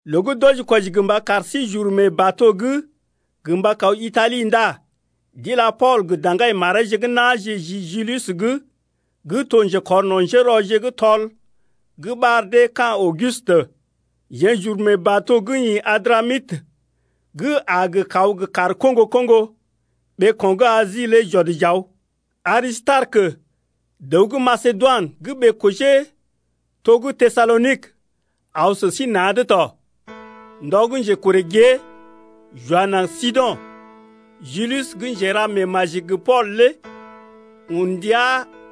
Loo gə́ d’wɔji-kwɔji gə mba kar sí j’uru mee bato’g gə mba kaw Itali ndá d’ila Pool gə daŋgai mareeje gə́ na̰je ji Julius’g gə́ to njekɔrno̰ njérɔje gə́ tɔl gə́ ɓar dee ka̰ Augustə. Jeḛ j’uru mee bato gə́ ḭ Adramitə gə́ a gə kaw gə kaar koŋgo-koŋgo ɓeeko̰ gə́ Asi lé j’ɔd j’aw, Arisitarekə, dəw gə́ Masedoinə gə́ ɓee-kojee to gə́ Tesalonik aw sə sí na̰’d tɔ. Ndɔ gə́ njekorè gée, j’wa naŋg Sido̰, Julius gə́ njera meemaji gə Pool lé un ndia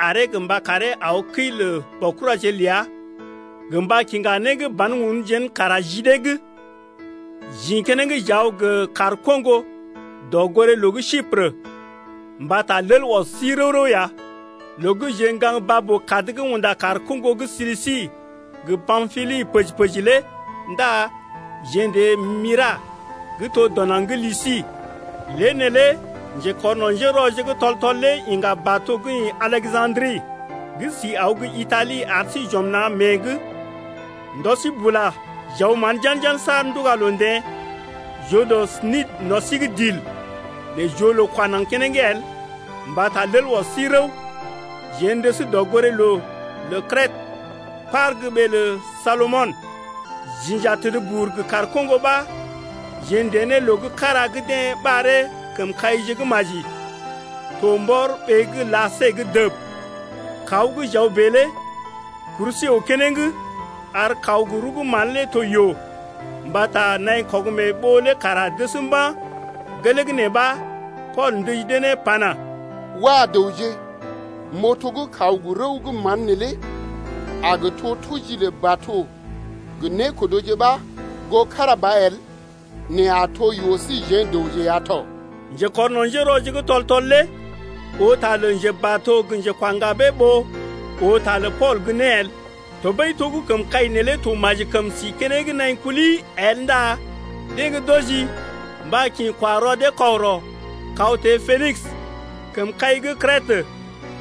aree gə mba karee aw kəi lə baokuraje ləa gə mba kiŋga né gə́ ban-un jén kara ji dee’g. J’ḭ keneŋ j’aw gə kaar koŋgo dɔgoré-loo gə́ Siprə, mbata lel ɔs sí rəw-rəw ya. Loo gə́ jeḛ gaŋg baa-boo-kad gə́ unda kaar koŋgo gə́ Silisi gə Pampili pəji-pəji lé ndá jeḛ n’teḛ Myra gə́ to dɔ naŋg gə́ Lisi. Lée neelé njekɔrno̰ njérɔje gə́ tɔl-tɔl lé iŋga bato gə́ ḭ Aleja̰dri gə́ si aw gə́ Itali ar sí j’ɔm na̰ mée’g. Ndɔ sí bula j’aw mán jan-jan saar n’tuga loo teḛ, j’oo dɔ Nidə no̰ sí’g dil, nɛ j’oo loo kwa naŋg keneŋ el mbata lel ɔs sí rəw. Jeḛ n’dəs dɔgoré-loo lə Krètə, par gə́ ɓee lə Salmɔnə. J’inja təd bur gə kaar koŋgo ɓa jeḛ n’teḛ ne loo gə́ kára gə́ deḛ ɓaree Kəmkaije gə́ Maji, to mbɔr ɓee gə́ Lasée’g dəb. Kaw gə́ j’aw bèe lé kur sí əw keneŋ ar kaw rəw gə́ mán lé to yoo mbata naḭ kɔg-mee-ɓoo lé kara dəs mba̰. Gelee gə́ nee ɓa Pool ndəji dee ne pana: Wah! dəwje m’oo to gə́ kaw gə rəw gə́ mán neelé a gə to tuji lə bato gə nékodoje ɓa goo kára ba el, nɛ a to yoo síjeḛ dəwje ya tɔ. Njekɔrno̰ njérɔje gə́ tɔl-tɔl lé oo ta lə njebato gə njekwa ŋgabee ɓó oo ta lə Pool gə́ né el. Tɔɓəi to gə́ kəmkai neelé to maji kəm si keneŋ naḭ kuli el ndá deḛ gə́ d’wɔji mba kḭ kwa rɔ dee kɔgərɔ kaw teḛ Penis, kəmkai gə́ Krètə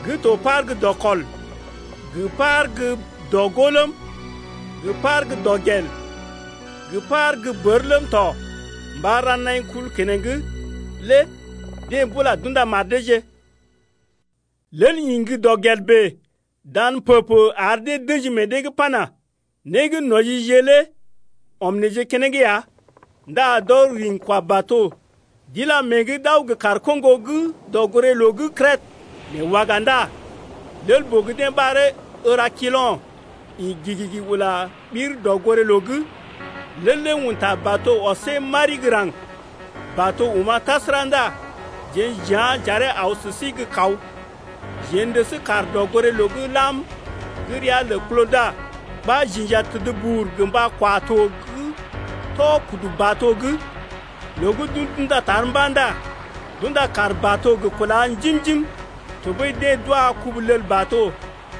gə́ to par gə́ dɔkɔl gə́ par gə́ dɔ-gó ləm, gə par gə́ dɔgel gə́ par gə́ bər ləm tɔ mba ra naḭ kul keneŋ lé deḛ bula d’unda mar deeje. Lel ḭ gə́ dɔgel bèe dan pə-pə ar dee d’ə̰ji meḛ dee’g pana: Né gə́ n’wɔjije lé ɔm neḛje keneŋ ya ndá d’ɔr riŋgi-kwa-bato d’ila mée’g d’aw gə kaar koŋgo gə́ dɔgoré-loo gə́ Krètə. Nɛ waga ndá lel-boo gə́ deḛ ɓaree Erakilo̰ ḭ gigigi ula ɓir dɔgoré-loo’g. Lel lé un ta bato ɔsee mari gə́ raŋg. Bato oma̰ tasəra ndá jeḛ j’yá̰ j’aree aw sə sí gə kaw. Jeḛ n’dəs kaar dɔgoré-loo gə́ lam gə́ ria lə Klauda ɓa j’inja təd bur gə mba kwa to gə́ tɔ kudu bato’g. Loo gə́ d’un d’unda tar mba̰ ndá d’unda kaar bato gə kúla njim-njim tɔɓəi deḛ d’wa kubu-lel-bato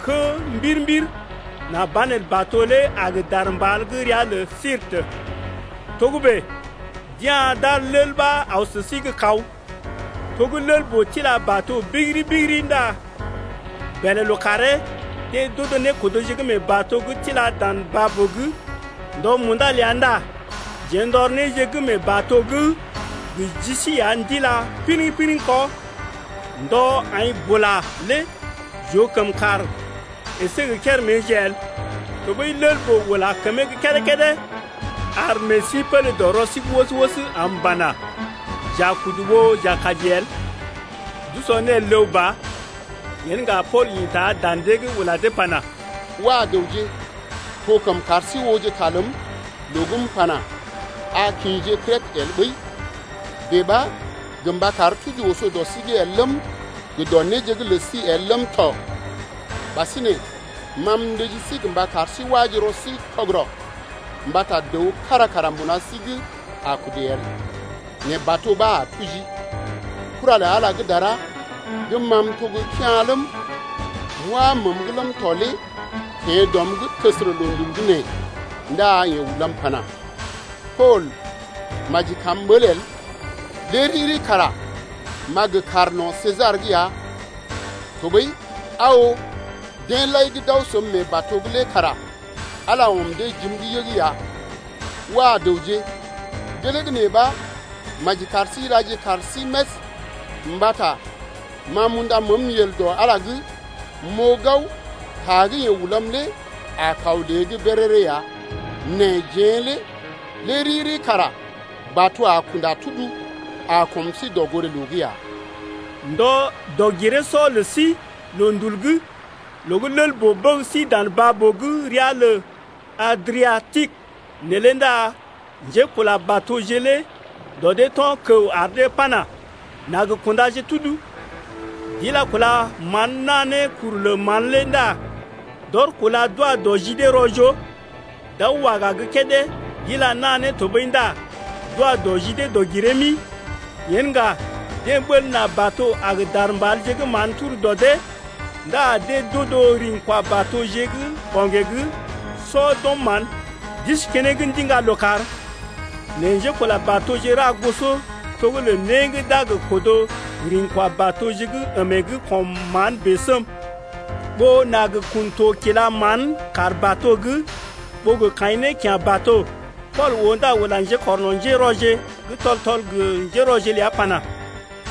kə́ mbir-mbir nà banelə bato lé a gə dar mbal gə́ ria lə Sirte. Togə́bè d’ya̰ d’ar lel ɓa aw sə sí gə́ kaw. To gə́ lel-boo tila bato bigiri-bigiri ndá bèlè lookàree deḛ d’odo nékodoje gə́ mee bato’g tila dan baa-boo’g. Ndɔ munda ləa ndá jeḛ n’tɔr néje gə́ mee bato’g gə ji sí ya n’tila piriŋ-piriŋ kɔ. Ndɔ aḭ bula lé j’oo kəm kàr əsé gə kéréméje el tɔɓəi lel-boo ula kəmee gə́ kédé-kédé, ar meḛ sí pélé dɔ rɔ sí’g wəs-wəs m’pana: J’a kudu ɓó j’a kaji el. D’usɔ né el ləw ba. Yen ŋga Pool ḭta dan dee’g ula dee pana: Wah dəwje, to kəm kar sí ooje ta ləm loo gə́ m’pana: A kḭje Krètə el ɓəi, bèe ɓa gə mba kar tuji oso dɔ sí’g el ləm gə dɔ néje gə́ lə sí el ləm tɔ. Ɓasinè ma m’ndəji sí gə mba kar sí waje rɔ sí kɔgərɔ mbata dəw kára kara mbuna sí’g a kudu el, nɛ bato ɓa a tuji. Kura lə Ala gə́ dara gə́ ma m’to gə́ kea̰ ləm, m’wá məəm’g ləm tɔ lé teḛ dɔm’g təsərə loondul gə́ nee ndá yeḛ ulam pana: Pool, maji kam m’ɓəl el, lé riri kara m’a gə kaar no̰ Sesar’g ya tɔɓəi aa oo, deḛ lai gə́ d’aw səm mee bato’g lé kara Ala ɔm dee jim’g yəg ya. Wah dəwje, gelee gə́ nee ɓa maji kar sí ilaje kaar sí més, mbata ma m’unda məəm yel dɔ Ala’g m’oo gao ta gə́ yeḛ ulam lé a kaw lée’g béréré ya. Nɛ jeḛ lé lé riri kara bato a kunda tudu a kɔm sí dɔgoré-loo’g ya. Ndɔ dɔg-giree-sɔ lə sí loondul’g loo gə́ lel-boo bəg sí dan baa-boo gə́ ria lə Adriatikə neelé ndá njékula-batoje lé dɔ dee to̰ kəw ar dee pana: N’a gə kundaje tudu. D’ila kúla mán naa ne kuru lə mán lé ndá d’ɔr kúla kwa dɔ ji dee rɔ-joo, d’aw waga gə́ kédé d’ila naa ne tɔɓəi ndá d’wa dɔ ji dee dɔg-giree-mi. Yen ŋga deḛ ɓəl nà bato a gə dar mbalje gə́ mán turu dɔ dee ndá deḛ d’odo riŋgi-kwa-batoje gə́ ɓo̰gee’g sɔ d’ɔm mán, d’isi keneŋ ndiŋga lookàr. Nɛ njékula-batoje ra goso to gə́ lə né gə́ d’a gə kodo riŋgi-kwa-batoje gə́ əmee’g kɔm mán bèe səm, ɓó nà gə kun to kila mán kaar bato’g, ɓó gə kaḭ ne kya̰ bato. Pool oo ndá ula njekɔrno̰ njérɔje gə́ tɔl-tɔl gə njérɔje ləa pana: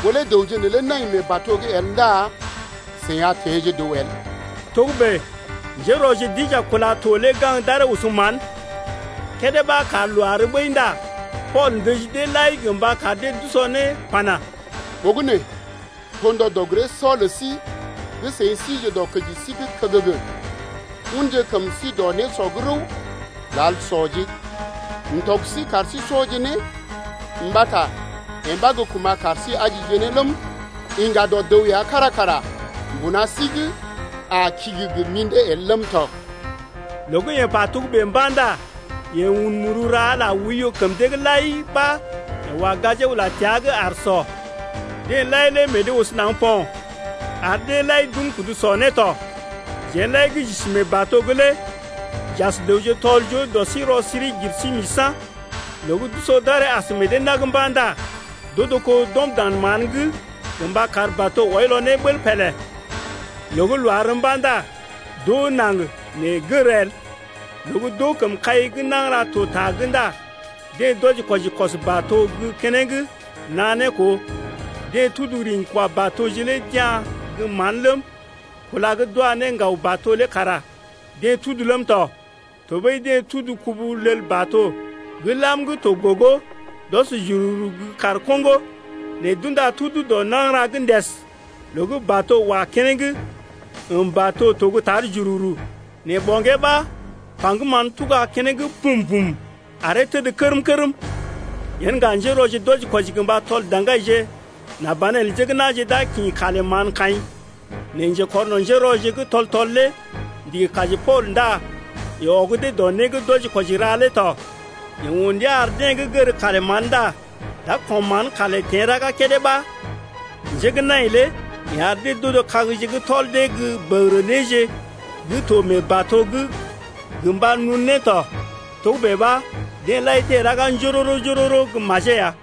Ɓó lé dəwje neelé nai mee bato’g el ndá seḭ a teḛje dəw el. Togə́bè njérɔje d’inja kúla to lé gaŋg d’aree oso mán. Kédé ɓa kar loo àr ɓəi ndá Pool ndəji deḛ lai gə mba kar dee d’usɔ né pana: Ɓogənè to ndɔ dɔg-giree-sɔ lə sí gə́ seḭ sije dɔkəji sí’g kəgəgə, unje kəm sí dɔ nésɔ’g rəw, lal sɔje. M’tɔg sí kar sí sɔje né, mbata yee ɓa gə́ kuma̰ kar sí ajije ne ləm, yiŋga dɔ dəw ya kára kara mbuna sí’g a kigi gə mḭdé el ləm tɔ. Loo gə́ yeḛ pa togə́bè ndá yeḛ un muru ra Ala oiyo kəm dee’g lai ɓa yeḛ wa gajee ula təa’g aar sɔ. Deḛ lai lé meḛ deḛ oso naŋg po̰ ar deḛ lai d’un kudu sɔ né tɔ. Jeḛ lai gə́ j’isi mee bato’g lé j’as dəwje tɔl-joo dɔ sí rɔ-siri-gir-sí-misa̰. Loo gə́ d’usɔ d’aree as meḛ dee nag mba̰ ndá d’odo kó d’ɔm dan mán’g gə mba kar bato wɔilɔ ne bəl pélé. Loo gə́ loo àr mba̰ ndá d’oo naŋg nɛ gər el. Loo gə́ d’oo kəmkai gə́ nagəra to ta’g ndá deḛ d’wɔji-kwɔji kɔs bato gə́ keneŋ naa ne koo. Deḛ tudu riŋgi-kwa-batoje lé d’ya̰ gə́ mán ləm, kúla gə́ d’wa ne ŋgaw bato lé kara dee tudu ləm tɔ. Tɔɓəi deḛ tudu kubu-lel-bato gə́ lam gə́ to gogo d’ɔs jururu gə́ kaar koŋgo’g. Nɛ d’unda tudu dɔ nagəra’g ndəs loo gə́ bato wa keneŋ, əm bato to gə́ tar jururu nɛ ɓo̰gee ɓa paŋgəm mán tuga keneŋ pum-pum aree təd kərm-kərm. Yen ŋga njérɔje d’wɔji-kwɔji gə mba tɔl daŋgaije nà banelə njé gə́ na̰je d’a kḭ kalè mán kaḭ. Nɛ njekɔrno̰ njérɔje gə́ tɔl-tɔl lé ndigi kaji Pool ndá yeḛ ɔg dee dɔ né gə́ d’wɔji-kwɔji ra’g lé tɔ. Yeḛ un ndia ar deḛ gə́ gər kalé mán ndá d’a kɔm mán kalè teḛ raga kédé ɓa njé gə́ nai lé yeḛ ar dee d’odo kagje gə́ tɔl dee gə bəgərə néje gə́ to mee bato’g gə mba nun ne tɔ. Togə́bè ɓa deḛ lai teḛ raga njoro-njoro gə majee ya.